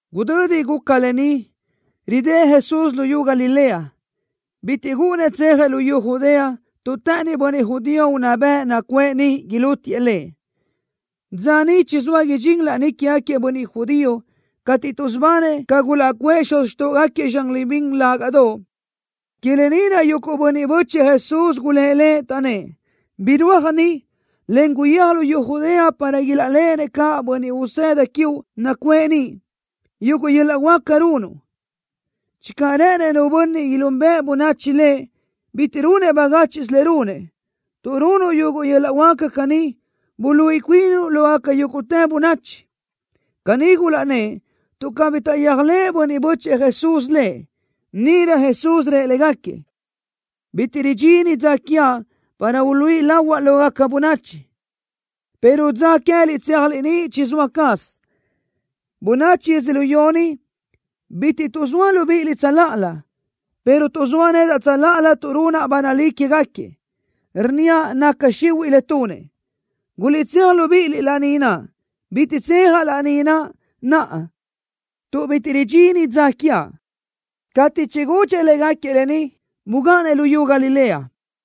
Gudödi guca lë ni ridë́ʼ Jesús luyú Galilea. Bitiʼ gúʼunnëʼ tsejëʼ luyú Judea tuʼ të́ʼënnëʼ bönniʼ judío unná bëʼ nacuʼë niʼ ilútiëʼ Lëʼ. Dza niʼ chizóa idxín laní quégaquiëʼ bönniʼ judío cateʼ tuʼsubanëʼ ca gulaʼcuʼë xuz xtóʼogaquiëʼ zxan libín lágaʼdoʼ. Que lë ni naʼ yuguʼ bönniʼ bö́chëʼë Jesús gulë́ʼ Lëʼ, taʼnnë́ʼ: —Birúaj ni, en guyéaj luyú Judea para ilaʼléʼenëʼ caʼ bönniʼ usëda quiuʼ nacuʼë niʼ yuguʼ yöl-laʼ huáca runuʼ. Channö rë́ʼënëʼ nu bönniʼ ilúnbëʼe bönachi lëʼ, bitiʼ runëʼ bagáchiʼsö le runëʼ. Tuʼ runuʼ yuguʼ yöl-laʼ huáca caní, buluíʼi cuinuʼ lógaca yúguʼtë bönachi. Caní gulaʼnnë́ʼ, tuʼ cabí taʼyéajlëʼë bönniʼ bö́chëʼë Jesús Lëʼ. Níʼirö Jesús rëʼ légaquiëʼ: —Bitiʼ ridxini dza quiaʼ para uluíʼi lahuaʼ lógaca bönachi, pero dza queë́liʼ tséajliʼ niʼ chizóa caz. Bönachi yödzölió ni bitiʼ tuʼzóa libíʼiliʼ tsöláʼalö, pero tuʼzóa nedaʼ tsöláʼalö tuʼ runaʼ ba nalí quégaquiëʼ, rnníaʼ naca xihuiʼ le tunëʼ. Guliʼtséaj libíʼiliʼ laní naʼ. Bitiʼ tsejaʼ laní naʼ naʼa tuʼ bitiʼ ridxini dza quiaʼ. Cateʼ chigudxëʼ légaquiëʼ lë ni, bugáʼanëʼ luyú Galilea.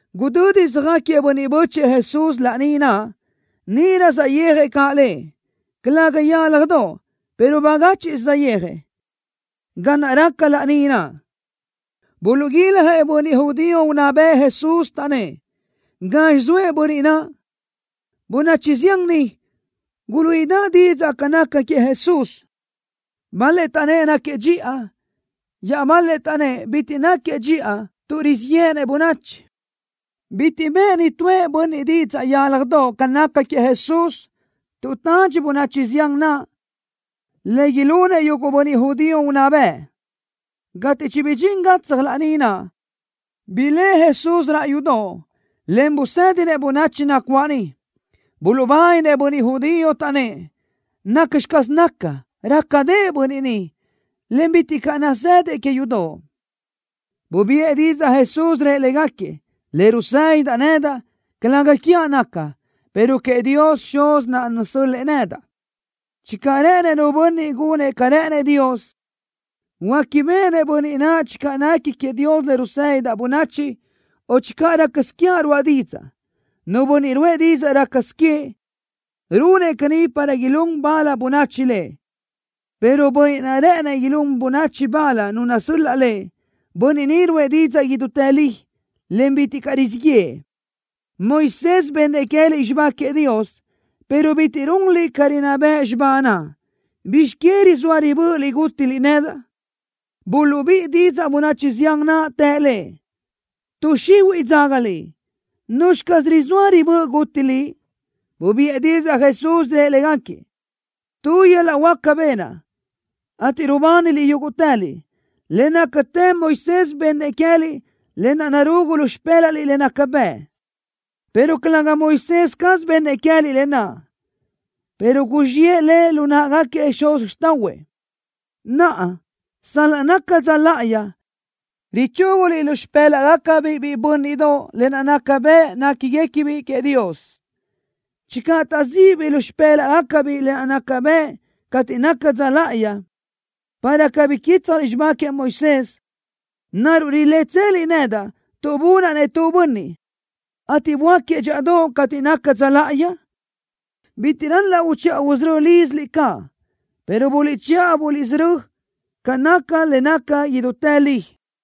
Gudödi söjáquiëʼ bönniʼ bö́chëʼë Jesús laní naʼ, níʼirö saʼyéajëʼ caʼ Lëʼ, calëga yálajdoʼ, pero bagáchiʼsö saʼyéajëʼ. Ga naʼ raca laní naʼ, buluʼguiljëʼ bönniʼ judío unná bëʼ Jesús, taʼnnë́ʼ: —¿Gazxi zoëʼ bönniʼ naʼ? Bönachi zián niʼ guluíʼidaʼ didzaʼ ca naca queëʼ Jesús. Bal-lëʼ taʼnnë́ʼ: —Náquiëʼ dxiʼa. Iaʼbal-lëʼ taʼnnë́ʼ: —Bitiʼ náquiëʼ dxiʼa tuʼ rizíʼ yéʼenëʼ bönachi. Bitiʼ bëʼë nitúëʼ bönniʼ didzaʼ yálajdoʼ ca naca queëʼ Jesús, tuʼ tadxi bönachi zián naʼ le ilunëʼ yuguʼ bönniʼ judío unná bëʼ. Cateʼ chibidxín gatsaj laní naʼ, blëʼë Jesús raʼ yudoʼ, en busédinëʼ bönachi nacuáʼ niʼ. Buluʼbáninëʼ bönniʼ judío, taʼnnë́ʼ: —¿Nacxi caz naca, rácadëʼë bönniʼ ni, en bitiʼ caʼ nazëdëʼ que yudoʼ? Bubiʼë didzaʼ Jesús, rëʼ légaquiëʼ: —Le rusédidaʼ nedaʼ, calëga quiaʼ naca, pero queëʼ Dios Xuz naʼ nasö́l-lëʼë nedaʼ. Channö rë́ʼënëʼ nu bönniʼ gunëʼ ca rë́ʼënëʼ Dios, huéquibeʼenëʼ bönniʼ naʼ channö nequi queëʼ Dios le rusédidaʼ bönachi o channö rácasö quiaʼ ruáʼa didzaʼ. Nu bönniʼ ruʼë didzaʼ rácasö queëʼ, runëʼ caní para ilún bal bönachi lëʼ, pero Bönniʼ naʼ rë́ʼënëʼ ilún bönachi bal Nu nasöl-laʼ lëʼ, Bönniʼ ni ruʼë didzaʼ idútë li, en bitiʼ caʼ rizíʼ yëʼë. ’Moisés bennëʼ queë́liʼ xibá queëʼ Dios, pero bitiʼ runliʼ ca rinná bëʼ xibá naʼ. ¿Bizx que rizóa ribö́ʼöliʼ gútiliʼ nedaʼ? Buluʼbíʼi didzaʼ bönachi zián naʼ, të Lëʼ: —Tuʼ xihuiʼ dzaga liʼ. ¿Nuzxi caz rizóa ribö́ʼö guti liʼ? Bubiʼë didzaʼ Jesús, rëʼ légaquiëʼ: —Tu yöl-laʼ huáca benaʼ, ateʼ rubániliʼ yúguʼtëliʼ. Le nácatë Moisés bennëʼ queë́liʼ lë naʼ narugu lu xipë́laʼliʼ le naca bëʼ, pero calëga Moisés caz bennëʼ queë́liʼ lë naʼ, pero guzxiʼë le lu náʼagaquiëʼ xuz xtáʼahuëʼ. Naʼa, sal-laʼ naca dza láʼayi, richúguliʼ lu xipë́laʼgacabiʼ biʼi bö́nniʼdoʼ lë naʼ naca bëʼ néquiguequibiʼ queëʼ Dios. Channö taʼzíʼibiʼ lu xipë́laʼgacabiʼ lë naʼ naca bëʼ cateʼ naca dza láʼayi, para cabí quítsjaliʼ xibá queëʼ Moisés, ¿naruʼ rilétseliʼ nedaʼ tuʼ bunaʼ-nëʼ tu bönniʼ, ateʼ böáquiëʼ dxíʼadoʼ cateʼ naca dza láʼayi? Bitiʼ ral-laʼ uchiʼa usörö́ líziliʼ caʼ, pero buliʼchiʼa buliʼsörö́ ca naca le naca idútë li.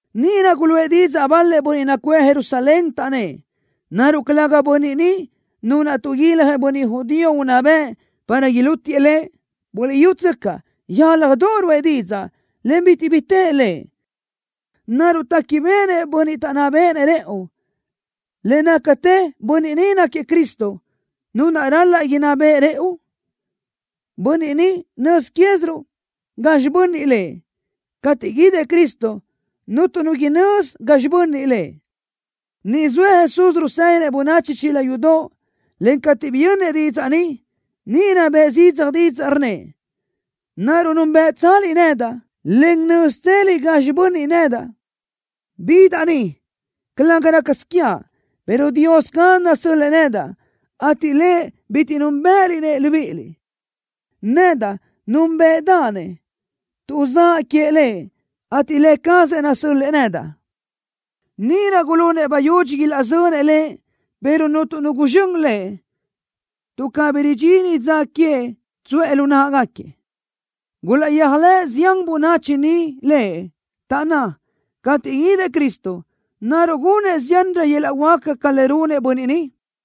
Níʼirö guluʼë didzaʼ bal-lëʼ bönniʼ nacuʼë Jerusalén, taʼnnë́ʼ: —¿Naruʼ calëga bönniʼ ni Nu naʼ tuʼguiljëʼ bönniʼ judío unná bëʼ para ilútiëʼ Lëʼ? Buliʼyútsöcaʼ, yálajdoʼ ruʼë didzaʼ, en bitiʼ bi tëʼ Lëʼ. ¿Naruʼ téquibeʼenëʼ bönniʼ taʼnná béʼenëʼ rëʼu, le nácatë bönniʼ ni náquiëʼ Cristo, Nu naʼ ral-laʼ inná beʼe rëʼu? Bönniʼ ni, nöz quéziruʼ gazxi bönniʼ Lëʼ. Cateʼ guídëʼ Cristo, cuntu nu inözi gazxi bönniʼ Lëʼ. Niʼ zoëʼ Jesús rusédinëʼ bönachi chila yudoʼ, en cateʼ biyönnëʼ didzaʼ ni, níʼirö bëʼë zidzaj didzaʼ, rnnëʼ: —¿Naruʼ núnbeʼetseliʼ nedaʼ, en nö́zitseliʼ gazxi bönniʼ nedaʼ? Bidaʼ ni, calëga rácasö quiaʼ, pero Dios caz nasö́l-lëʼë nedaʼ, ateʼ Lëʼ, bitiʼ núnbëʼëliʼ-nëʼ libíʼiliʼ. Nedaʼ núnbeʼedaʼ-nëʼ, tuʼ zaʼa queëʼ Lëʼ, ateʼ Lë cazëʼ nasö́l-lëʼë nedaʼ. Níʼirö gulunëʼ bayudxi ilaʼzönëʼ Lëʼ, pero cuntu nu guzxö́n Lëʼ, tuʼ cabí ridxini dza queëʼ tsuʼë lu náʼagaquiëʼ. Gulaʼyéajlëʼ zián bönachi niʼ Lëʼ, taʼnná: —Cateʼ guídëʼ Cristo, ¿naruʼ gunëʼ ziánrö yöl-laʼ huáca ca le runëʼ bönniʼ ni?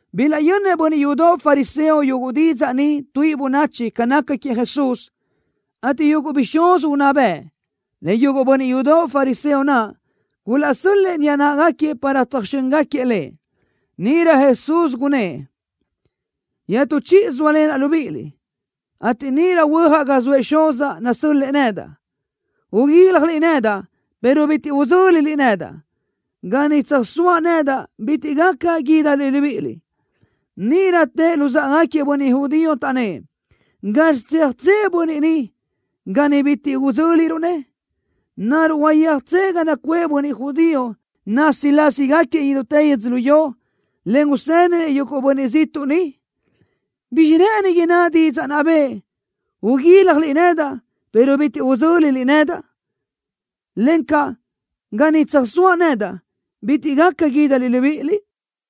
Bilaʼyönnëʼ bönniʼ yudoʼ fariseo yuguʼ didzaʼ ni tuíʼi bönachi ca naca queëʼ Jesús, ateʼ yuguʼ bixúz unná bëʼ, en yuguʼ bönniʼ yudoʼ fariseo naʼ gulaʼsö́l-lëʼë niʼa náʼagaquiëʼ para tsöjxö́ngaquiëʼ Lëʼ. Níʼirö Jesús gunnë́ʼ: —Iaʼtú chíʼisö sóalenaʼ libíʼiliʼ, ateʼ níʼirö huöjaʼ ga zoëʼ Xuzaʼ nasö́l-lëʼë nedaʼ. Uguíljaliʼ nedaʼ, pero bitiʼ udzö́liliʼ nedaʼ. Ga niʼ tsöjsóaʼ nedaʼ bitiʼ gaca guídaliʼ libíʼiliʼ. Níʼirö tëʼ luzáʼagaquiëʼ bönniʼ judío, taʼnnë́ʼ: —¿Gazxi tséajtsëʼ bönniʼ ni, ga niʼ bitiʼ udzö́liruʼ-nëʼ? ¿Naruʼ huayéajtsëʼ ga nacuʼë bönniʼ judío násilasigaquiëʼ idútë yödzölió, en usédinëʼ yuguʼ bönniʼ ziʼtuʼ niʼ? ¿Bizxi rë́ʼëni inná didzaʼ naʼ bëʼë: “Uguíljaliʼ nedaʼ, pero bitiʼ udzö́liliʼ nedaʼ”, encaʼ: “Ga niʼ tsöjsóaʼ nedaʼ bitiʼ gaca guídaliʼ libíʼiliʼ”?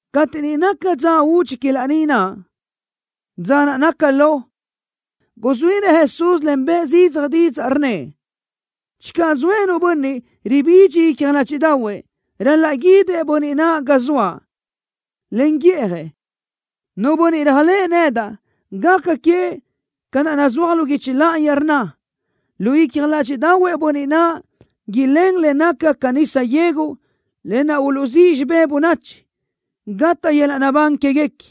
Cateʼ niʼ naca dza údxi que laní naʼ, dza naʼ naca lo, guzuínëʼ Jesús, en bëʼë zidzaj didzaʼ, rnnëʼ: —Channö zoëʼ nu bönniʼ ribidxi icja ládxiʼdaʼahuëʼ, ral-laʼ guídëʼ bönniʼ naʼ ga zoaʼ, en guíʼjëʼ. Nu bönniʼ réajlëʼë nedaʼ, gaca queëʼ ca naʼ nazúaj lu guichi láʼayi, rnna: Lu icja ládxiʼdaʼahuëʼ bönniʼ naʼ ilén le naca ca nisa yegu, lë naʼ uluʼzíʼ xibé bönachi, gataʼ yöl-laʼ naʼbán quéguequi.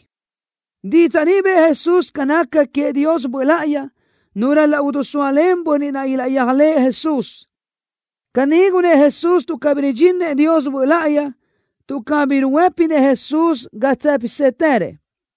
Didzaʼ ni bëʼë Jesús ca naca queëʼ Dios Böʼ Láʼayi, Nu ral-laʼ idisóalen bönniʼ naʼ ilaʼyéajlëʼë Jesús. Caní gunnë́ʼ Jesús tuʼ cabí ridxíninëʼ Dios Böʼ Láʼayi, tuʼ cabí ruhuë́pinëʼ Jesús ga tsë́pisëtërëʼ.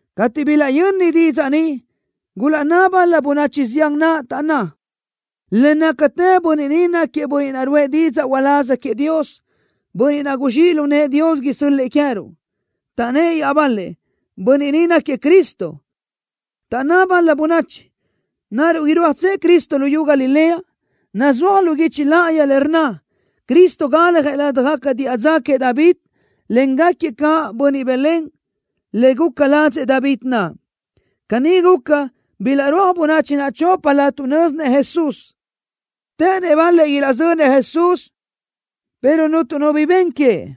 Cateʼ bilaʼyöni didzaʼ ni, gulaʼnná bal-la bönachi zián naʼ, taʼnná: —Le nácatë Bönniʼ ni náquiëʼ Bönniʼ naʼ ruʼë didzaʼ uláz queëʼ Dios, Bönniʼ naʼ guzxíʼ lu nëʼë Dios isö́l-lëʼë queë́ruʼ. Taʼnnë́ʼ iaʼbal-lëʼ: —Bönniʼ ni náquiëʼ Cristo. Taʼnná bal-la bönachi: —¿Naruʼ irúajtsëʼ Cristo luyú Galilea? Nazúaj lu guichi láʼayi le rnna: “Cristo galjëʼ ladaj diʼa dza queëʼ David, en gáquiëʼ caʼ bönniʼ Belén le guca ladzëʼ David naʼ.” Caní guca, bilaʼrúaj bönachi naʼ choplö tuʼ nö́zinëʼ Jesús. Të́ʼënnëʼ bal-lëʼ ilaʼzönëʼ Jesús, pero cuntu nu bi ben queëʼ.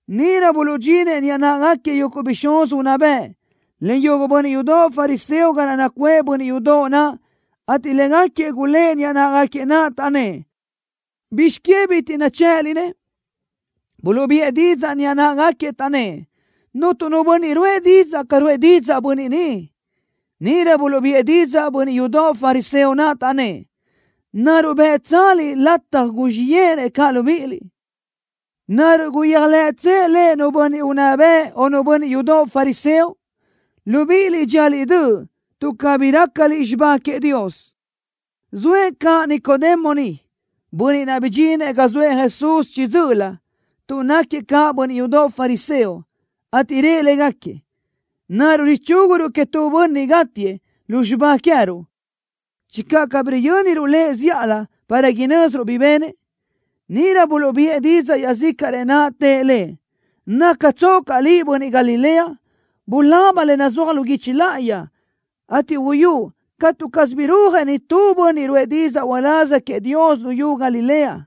Níʼirö buluʼdxinëʼ niʼa náʼagaquiëʼ yuguʼ bixúz unná bëʼ, en yuguʼ bönniʼ yudoʼ fariseo ga naʼ nacuʼë bönniʼ yudoʼ naʼ, ateʼ légaquiëʼ gulë́ʼ niʼa náʼagaquiëʼ naʼ, taʼnnë́ʼ: —¿Bizx que bitiʼ dichë́ʼëliʼ-nëʼ? Buluʼbiʼë didzaʼ niʼa náʼagaquiëʼ, taʼnnë́ʼ: —Cuntu nu bönniʼ ruʼë didzaʼ ca ruʼë didzaʼ Bönniʼ ni. Níʼirö buluʼbiʼë didzaʼ bönniʼ yudoʼ fariseo naʼ, taʼnnë́ʼ: —¿Naruʼ bë́ʼtsaliʼ lataj guzxíʼ yéʼenëʼ caʼ libíʼiliʼ? ¿Naruʼ guyéajlëʼtsëʼ Lëʼ nu bönniʼ unná bëʼ o nu bönniʼ yudoʼ fariseo? Libíʼiliʼ dxíaliʼ döʼ tuʼ cabí rácaliʼ xibá queëʼ Dios. Zoëʼ caʼ Nicodemo niʼ, bönniʼ naʼ bidxinëʼ ga zoëʼ Jesús chiʼi dzö́ʼölö, tuʼ náquiëʼ caʼ bönniʼ yudoʼ fariseo, ateʼ rëʼ légaquiëʼ: —¿Naruʼ richúguruʼ queëʼ tu bönniʼ gátiëʼ lu xibá queë́ruʼ channö cabí yö́niruʼ lëʼ zíʼalö para inö́ziruʼ bi benëʼ? Níʼirö buluʼbiʼë didzaʼ iaʼzícaʼrëʼ naʼ, tëʼ lëʼ: —¿Nácatsoʼ caʼ liʼ bönniʼ Galilea? Bulaba le nazúaj lu guichi láʼayi, ateʼ uyúʼ catu caz birúaj nitúëʼ bönniʼ ruʼë didzaʼ uláz queëʼ Dios luyú Galilea.